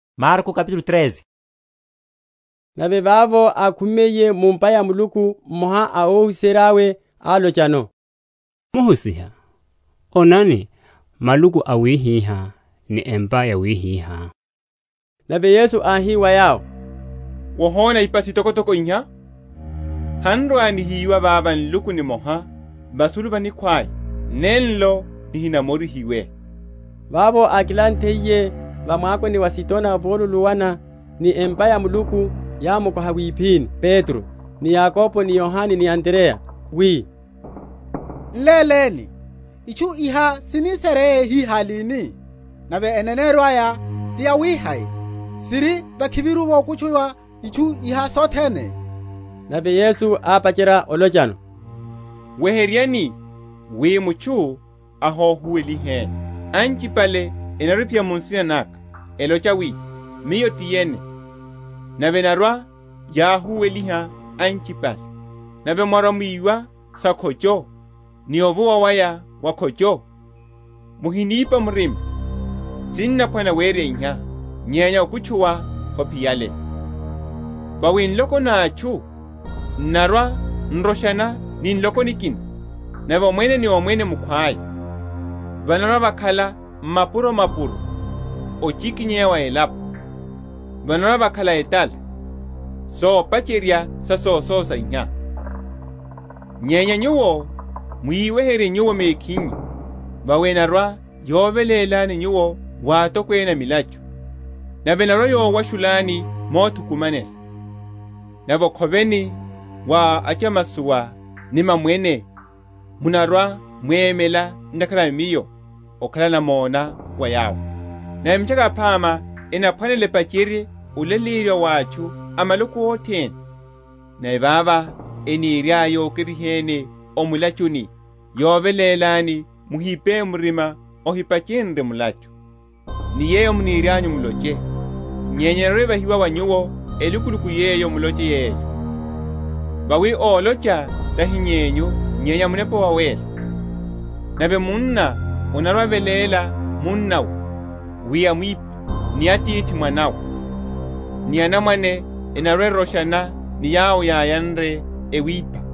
Sohosha sa muhólo. Nave vavo ákhumiye mu’mpa ya Muluku, mmoha a óhuserya’we álochano, Muhusiha, onani, maluku awihihá ni empa yawihihá. Nave Yesu áhi wa yawo, Wohona ipa sitokotoko iha? Han’rwa‐nihiyiwa vava nluku nimoha vasulu va nikhwaya, nenlo nihinamorihiwe. Vavo ákilanthiye va mwakoni wa Azitona, voluluwana ni empa ya Muluku, yámukoha wiphini Petro, ni Yakobo, ni Yohane, ni Andreya, wi, N’léleni, itchu iha sini sere hihá lini? Nave eneneryo aya ti yawihai yawi siri vakhiviru vokutchuwa itchu iha sothene? Nave Yesu ápacherya olochano, Weheryani wi mutchu ahohuweliheni. Anchipale enarwa‐ephiya mu nsina naka, elocha wi, Miyo ti yene, nave enarwa‐yahuweliha anchipale. Nave mwarwa‐mwiwa sa’khocho ni ovuwa waya wa’khocho, muhinipa murima; sinaphwanela wereya iha; nyenya okutchuwa hophiyale. Vawi nloko na atchu n’narwa‐n’roshana ni nloko nikina, nave omwene ni omwene mukhwaya; vanarwa‐vakhala m’mapuro‐mapuro ochikinyeya wa elapo; vanarwa‐vakhala etala; sopacherya sa sososa iha. Nyenya nyuwo mwiweherye nyuwo mekhinyu; vawi enarwa‐yovelélani nyuwo wa atokwene a milachu; nave enarwa‐yowashulani mothukumanela; nave okhoveni wa achamasowa ni mamwene munarwa‐mwemela ntakhara a Miyo okhala namona wa yawo. Nave Mitchaka Yaphama enaphwanela epacherye olaleyeriwa wa atchu a maloko othene. Nave vavo eniryaya yokeriheni o mulachuni, yovelélani, muhipe murima ohipachenrye mulachu, ni yeyo munirianyu muloche; nyenya yeyo enarwe‐evahiwe wa nyuwo elukuluku yeyo muloche yeyo; vawi ólocha tahi yenyu nyenya Munepa Wawéla. Nave munna anarwa‐aveléla munnawe wi amwiphe, ni atithi mwanawe, ni anamwane enarwa‐eroshana ni yawo yáyanre, ewiphiha.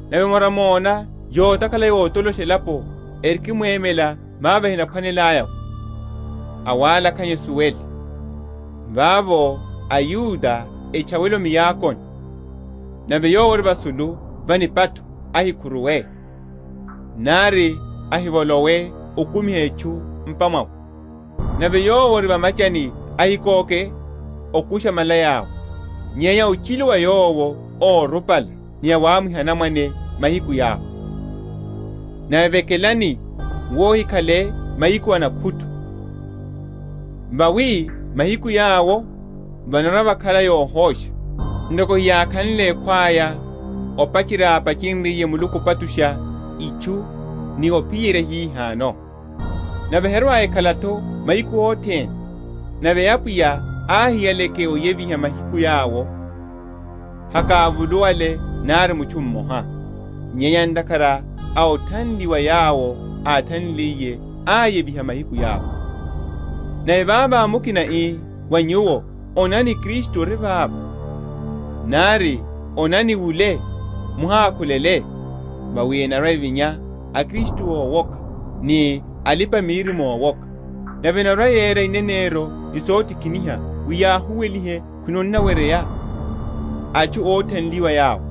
Nave mwárwa‐mona yotakhala yotolosha elapo erikimwemela vavo ehinaphwanelaya’vo (awalakhanya esuwele), vavo a Yuda etchawele o miakoni; nave yowo ori vasulu va nipatho ahikhuruwe, nari ahivolowe okumiha etchu m’pa mwawe; nave yowo ori va’machani, ahikoke okusha malaya’we. Nyenya ochilu wa awo órupala ni awamwiha anamwane mahiku yawo! Nave vekelani wi ohikhale m’mahiku a nakhutu. Vawi mahiku yawo vanarwa‐vakhala yohosha, ntoko heyákhanle ekhwaya opacherya vápachenryiye Muluku opachusha itchu ni ophiyerya hihano, nave herwa‐ekhala’tho mahiku othene. Nave Apwiya áhiyaleke oyeviha mahiku yawo, hakávuluwale nari mutchu mmoha; nyenya ntakhara a othanliwa yawo áthanliliye, áyeviha mahiku yawo. Nave vavo, mukina ii wa nyuwo, Onani Kristu ori vava; nari, Onani wule, muhakhulele; vawi enarwa‐evinya aKristu ówoka ni alipa‐miririmo ówoka, nave enarwa‐yera ineneryo ni sotikiniha wi yahuwelihe khwino onnaweryeya, atchu óthanliwa yawo.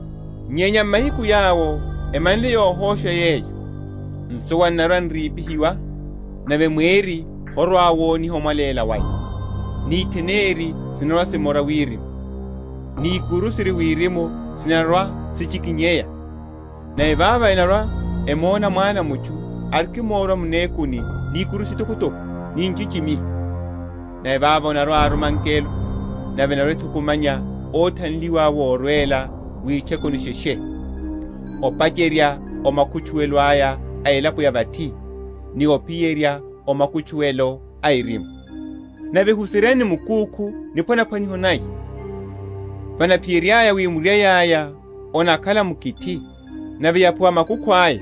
Nyenya m’mahiku yawo, emanle yohosha yeyo, nsuwa n’narwa‐n’rípihiwa, nave mweri horwa‐woniha omwaléla waya, ni itheneri sinarwa‐simora wirimu, ni ikuru siri wirimu sinarwa‐sichikinyeya. Nave vavo enarwa‐emona Mwana a mutchu arikimorwa m’mekuni ni ikuru sitokotoko, ni nchichimiho. Nave vavo anarwa‐aruma angelo, nave enarwa‐ethukumanya óthanliwa awe orwela witchekuni sheshe, opacherya o makutchuwelo aya a elapo ya vathi, ni ophiyerya o makutchuwelo a erimu. Nave huseryani ni mukúkhu niphwanaphwaniho naya; vanaphiyeryaya wi murai aya onakhala mukithi, nave yaphuwa makukhu aya,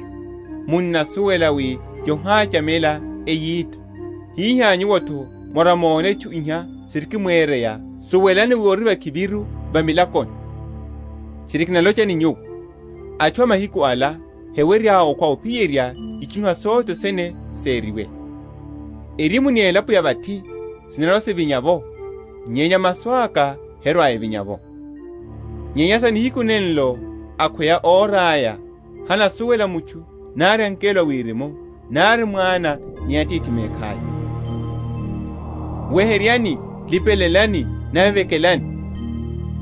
munnasuwela wi yohachamela eyita; hihá nyuwo’tho mwarwa‐mona itchu iha sirikimwereya, suwelani wi ori vakhiviru va milakoni. Tchiri kinalocha ni nyuwo, Atchu a mahiku ala hewerya okhwa ophiyerya itchu iha sothene seriwe. Erimu ni elapo ya vathi sinarwa‐sivinya’vo, nyenya masu aka herwa‐evinya’vo. Nyenya sa nihiku nenlo akhweya ora aya, hanasuwela mutchu, nari angelo a wirimu, nari Mwana, nyenya Atithi mekhaya. Sa olipelela. Weheryani, lipelelani, nave vekelani;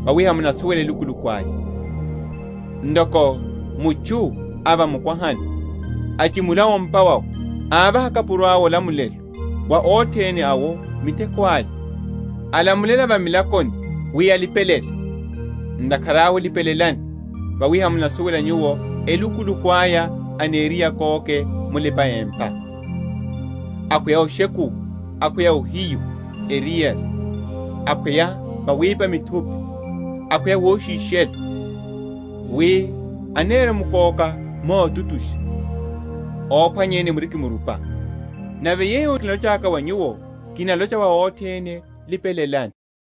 vawi hamunasuwela elukuluku aya. Ntoko mutchu a va mukwahani, áchimula o’mpa wawe, ávaha akapuro awe olamulelo, wa othene awo miteko aya, alamulela a va milakoni wi alipelele. Ntakhara awe lipelelani, vawi hamunasuwela nyuwo elukuluku aya aniriye akóke mulipa‐empa, akhweya oshekuwa, akhweya ohiyu eriyari, akhweya vawipa muthupi, akhweya woshishelo; wi aneremkóka motutusha, ophwanyeni murikimrupa. Nave yeyo kinalochaka wa nyuwo, kinalocha wa othene, Lipelelani.